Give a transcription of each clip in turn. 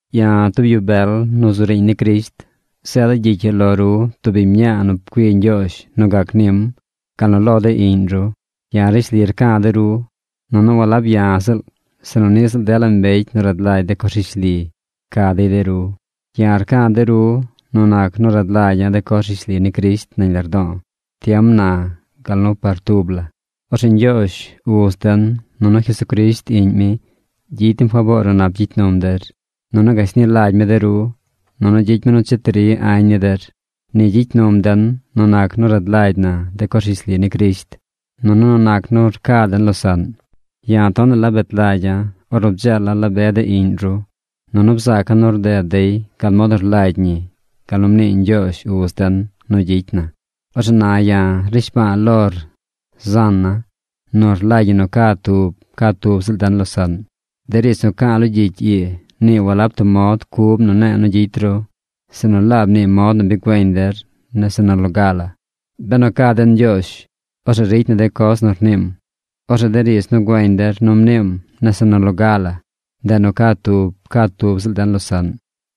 Ya̱, tub yu bel nu zu riiñ ni Crisht, zeeda̱ gyicy ii lo ru tub biñ mñaa nu pcui Ñgyoozh nu gac nim gal nu lo de iꞌñ ru. Ya̱ rishli rca̱ de ru, nunu walab ya̱ ziꞌl, sinu niꞌ ziꞌl dela mbecy nu rad lagy de coz rishli, rca dey de ru. Ya̱ rca̱ de ru nu nac nu rad lagya̱ de coz rishli ni Crisht nañ lardo̱o̱ tiem na gal nu par tub la. Orzeꞌ Ñgyoozh Uz den nunu Jesucrisht Iꞌñ mi gyicy dem faboor nu nap gyicy num der, nunu gashni lagy mi de ru, nunu gyicy mi nu cheti ri añ ni der. Ni gyicy num den nu nac nu rad lagy na de coz rishli ni Crisht, nunu nu nac nu rca den losaꞌn. Ya̱ tonaꞌ la bet lagya̱ ornu bdzeela̱ la be de iꞌñ ru. Nunu bzaaca̱ nu rded dey gal mod nu rlagy ñi gal nu mnii Ñgyoozh uz den nu gyicy na. Orzeꞌ na ya̱ rnishba̱a̱ lor zan na, nu rlagy ñi nu ca tub ca tub ziꞌl den losaꞌn. De riidz nu ca̱a̱ lo gyicy ii, nii walab tub mod cub nu ne̱e̱ nu gyicy ru, sinu laab nii mod nu bi güeñ der nese nu loga la. Benu ca den Ñgyoozh, orzeꞌ ricy na de coz nu rniim. Orzeꞌ de riidz nu güeñ der nu mniim nese nu loga la, ndeꞌ nu ca tub ca tub ziꞌl den losaꞌn.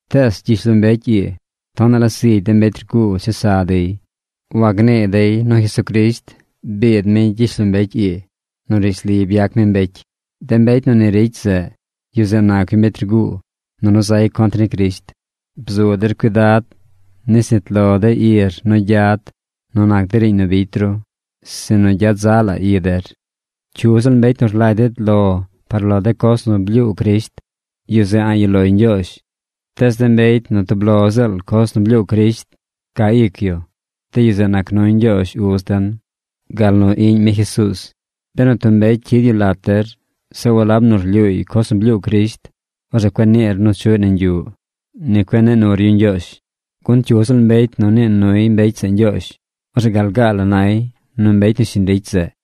Tees gyishlombecy ii tonaꞌ la zigy de mbecy rguu chesa dey. Wagnii dey nu Jesucrisht biid mi gyishlombecy ii nu rishli byac mi mbecy. De mbecy nu ni ricy zeꞌ, yu zeꞌ nac yu mbecy rguu, nunu zay contr ni Crisht. Bzu der cuidad nis nit lo de ir nu gyad nu nac de riiñ nu bicy ru, sinu gyad zaꞌ la i der. Cyu ziꞌl mbecy nu rlagy ded lo par lo de coz nu blyuu Crisht, yu zeꞌ a̱ꞌ yuꞌ loy Ñgyoozh. Tees mbecy nu tub lo ziꞌl coz blyuu Crisht caa ic yu, de yu zeꞌ nac nuy Ñgyoozh Uz den gal nu Iꞌñ mi Jesuuz. Benu tub mbecy cyid yu lat der, zeꞌ walab nu rlyuuy coz nu blyuu Crisht, orzeꞌ cueꞌ niir nu chuꞌy nañ yuꞌ. Ni cueꞌ nii nur yu ñgyoozh. Gun cyu ziꞌl mbecy nu nii nuy mbecy zeꞌ ñgyoozh, orzeꞌ gal gaa la nay nu mbecy nu shiñ ricy zeꞌ.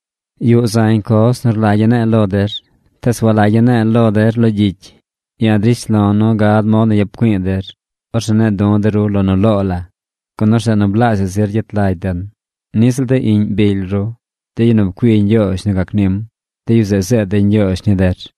Yuꞌ zañ coz nu rlagya̱ ne̱e̱ lo der, tees walagya̱ ne̱e̱ lo der lo gyicy. Ya̱ drish lo̱ nu gad mod nu yap güi̱i̱ der. Orzeꞌ ne̱e̱ du̱ de ru lo nu loo la, gun orzeꞌ nu blaazhaꞌ zir gyet lagy den. Niꞌ ziꞌl de iꞌñ bily ru, de yu nu pcui Ñgyoozh nu gac nim, de yu zeꞌ zeed dey ñgyoozh ni der.